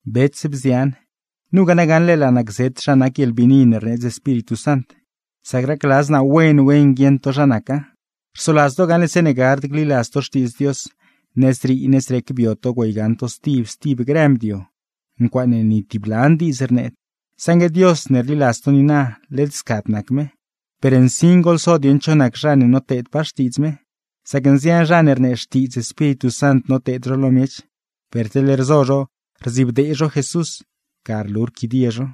Bets, bzian, nugaa na gaṉle laa naa gzet zha nac guieḻbiini ne rneedz Espíritu Sant, sac racladz naa wen wen guieṉ to zha naca. Rsoladz to gaṉle zeeṉe gard gliladz to Xtiidz Dios, nëzrii nëzrec bio to güeygaṉ to stib stib grë mdio, ncuaaṉe ni tib lan diidz rneed; saṉgue Dios ne rliladz to niina, led scad nac me. Per nsin goḻso dieṉ cho nac zha ne noteedpaa xtiidz me, sac nzian zha ne rnee xtiidz Espíritu Sant noteed zho lo miech, per teḻ rzo zho rdzibdee zho Jesús, ga rlu rquidie zho.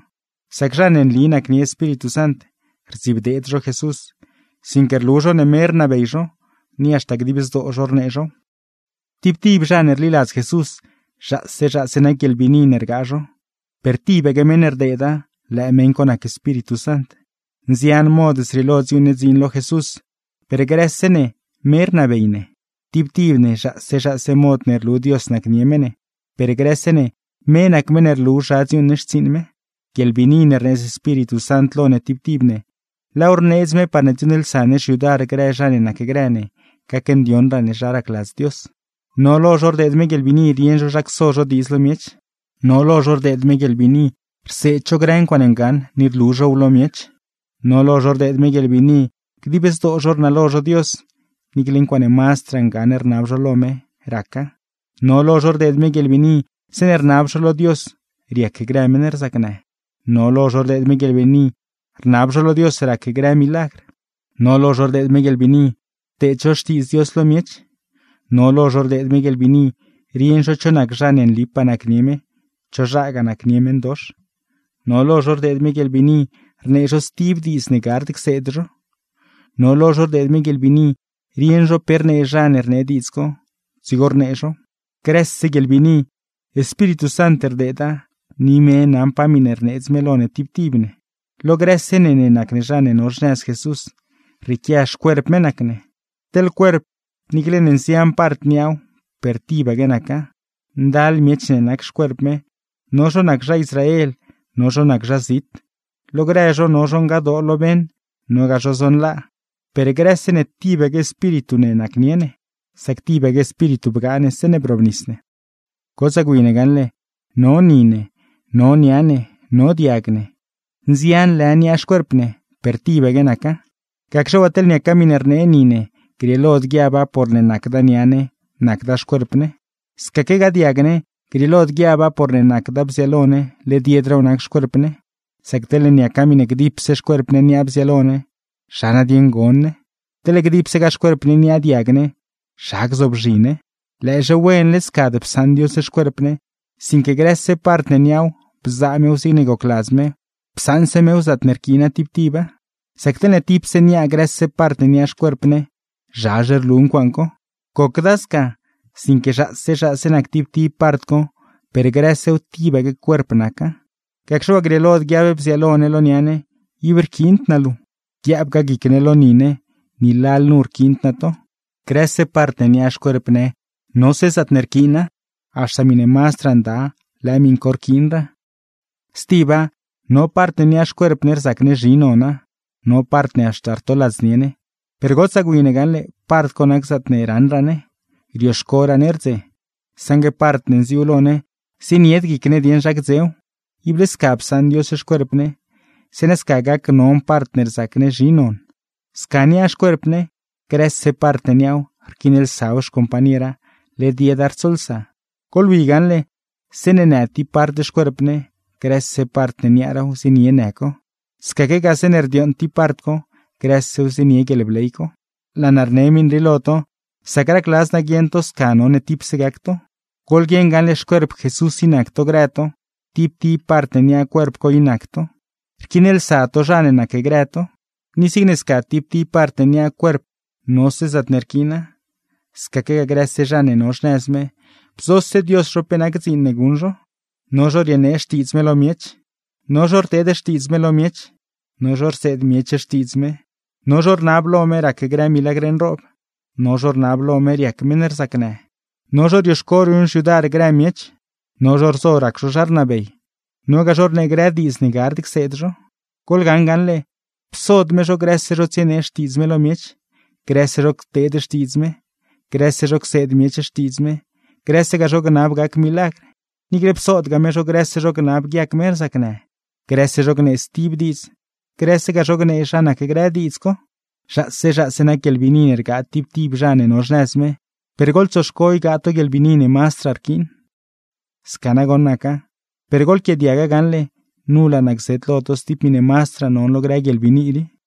Sac zha ne nli nacnie Espíritu Sant, rdzibdeed zho Jesús, sinque rlu zho ne me rnabey zho, ni haxta dib zdoo zho rnee zhow. Tib tib zha ne rliladz Jesús, zhaase zhaase nac guieḻbiini ne rgaa zho, per tibaque meṉ ne rdeeda, lëë meṉ co nac Espíritu Sant. Nzian mod zrieelo dziuuṉ ne dziin lo Jesús, per grëse ne me rnabey ne. Tib tib ne zhaase zhaase mod ne rlu Dios nacnie me ne, per grëse ne me nac meṉ ne rlu zha dziuuṉ ne xtsiiṉ me. Guieḻbiini ne rneedz Espíritu Sant lo ne tib tib ne, laaw rneedz me parne dziuuṉlsa ne xyudar grë zha ne nacgrë ne gacndioṉraa ne zha racladz Dios. No lo zho rdeed me guieḻbiini rieṉ zho zha cso zho diidz lo miech, no lo zho rdeed me guieḻbiini rseed zho grë ncuaaṉe ngaṉ ni rlu zhow lo miech. No lo zho rdeed me guieḻbiini dib zdoo zho rnalo zho Dios, niicle ncuaaṉe mazdraa ngaṉ rnab zho lo me, raca. No lo zho rdeed me guieḻbiini zeeṉe rnab zho lo Dios, riac grë meṉ rzacnë. No lo zho rdeed me guieḻbiini rnab zho lo Dios rac grë milagr, no lo zho rdeed me guieḻbiini rteed zho xtiidz Dios lo miech, no lo zho rdeed me guieḻbiini rieṉ zho cho nac zha ne nlipaa nacnie me, cho zhagaa nacnie meṉdox. No lo zho rdeed me guieḻbiini rnee zho stib diidz ne gard cseed zho, no lo zho rdeed me guieḻbiini rieṉ zho pe rnee zha ne rnee diidz co, dzigo rnee zhow. Grëse guieḻbiini, Espíritu Sant rdeeda, ni me naṉ pa miṉe rneedz me lo ne tib tib ne. Lo grëse ne ne nac ne zha ne no xnëz Jesús, rrieequia xcuerp me nac ne. Teḻ cuerp, niicle ne nzian part niaaw, per tibaque naca. Ndal miech ne nac xcuerp me, no zho nac zha Israel, no zho nac zha zit, lo grë zho no zho ngadoo lo beṉ, nogaa zho zonlaa, per grëse ne tibaque Espíritu ne nacnie ne, sac tibaque Espíritu bgaa ne zeeṉe brobnis ne. Gotsaa gwi ne gaṉle, no ni ne, no nia ne, no diag ne, nzian lë niaa xcuerp ne, per tibaque naca. Gacxe waa teḻne niaca miṉe rnee ni ne, grieelod guiaba porne nacda nia ne, nacda xcuerp ne. Scaque diag ne, grieelod guiaba porne nacda bziaalo ne led yedraaw nac xcuerp ne. Sac teḻne niaca miṉe gdipse xcuerp ne niaa bziaalo ne, ¿zha nadieṉ gon ne? Teḻne gdipsegaa xcuerp ne niaa diag ne, ¿zha gzoobzhi ne? Lëëzhe wen led scad psaṉ Dios xcuerp ne, sinque grëse part ne niaaw bzaa mew zigne gocladz me, psaṉse mew zaatne rquiina tib tiba. Sac teḻne tipse niaa grëse part ne nac xcuerp ne, ¡zhazhe rlu ncuaaṉ co! Gocda sca, sinque zhaase zhaase nac tib tib part co, per grësew tibaque cuerp naca. Gacxe waa grieelod guiab bziaalo ne lo nia ne: “Ib rquiind naa luu”; guiaabgaa guic ne lo ni ne: “Ni lalnu rquiind naa to.” Grëse part ne niaa xcuerp ne nose zaatne rquiina, haxta miṉe mazdraa nda lëë miṉ co rquiinraa. Stiba, no part ne niaa xcuerp ne rzac ne zhi nona, no part haxta rtoladznie ne, per gotsaa gwi ne gaṉle part co nac zaatne raṉraa ne, rioxcoraa ne rdze; saṉgue part ne nziuu lo ne, zienied guic ne dieṉ zha gdzew. Ible sca psaṉ Dios xcuerp ne, zeeṉa sca gacnon part ne rzac ne zhi non. Sca niaa xcuerp ne, grëse part ne niaaw rquiinlsaw xcompañera; led yeda rtsolsa. Goḻwi gaṉle, zeeṉe në tib part xcuerp ne, grëse part ne niaaraaw zienie në co; scaquegaa zeeṉe rdiooṉ tib part co grësew zienie guieḻbley co. Laa naa rne miṉ rii lo to, sac racladz naa guieṉ to sca none tipse gac to. Goḻguieṉ gaṉle xcuerp Jesús i nac to grë to, tib tib part ne niaa cuerp co i nac to, rquiinlsa to zha ne nacgrë to. Ni zigne sca tib tib part ne niaa cuerp nose zaatne rquiina, scaquegaa grëse zha ne no xnëz me, bzose Dios zho pe nac dziin ne guṉ zho: no zho rienee xtiidz me lo miech, no zho rteed xtiidz me lo miech, no zho rseed miech xtiidz me, no zho rnab lo me rac grë milagr nroob, no zho rnab lo me riac meṉ rzacnë, no zho rioxco ruṉ xyudar grë miech, no zho rzo rac zho zha rnabey, nogaa zho rnee grë diidz ne gard cseed zho. Goḻgaṉ gaṉle, psod me zho grëse zho tsienee xtiidz me lo miech, grëse zho cteed xtiidz me, grëse zho cseed miech xtiidz me, grësegaa zho gnab gac milagr. Niicle psodgaa me zho grëse zho gnab guiac meṉ rzacnë, grëse zho gnee stib diidz, grësegaa zho gnee zha nac grë diidz co. Zhaase zhaase nac guieḻbiini ne rgaa tib tib zha ne no xnëz me, per goḻtsoxco ygaa to guieḻbiini ne mazdraa rquiin. Sca nagoṉ naca, per goḻquiaadiaga gaṉle, nu laa naa gzet lo to stib miṉe mazdraa non lo grë guieḻbiini rii.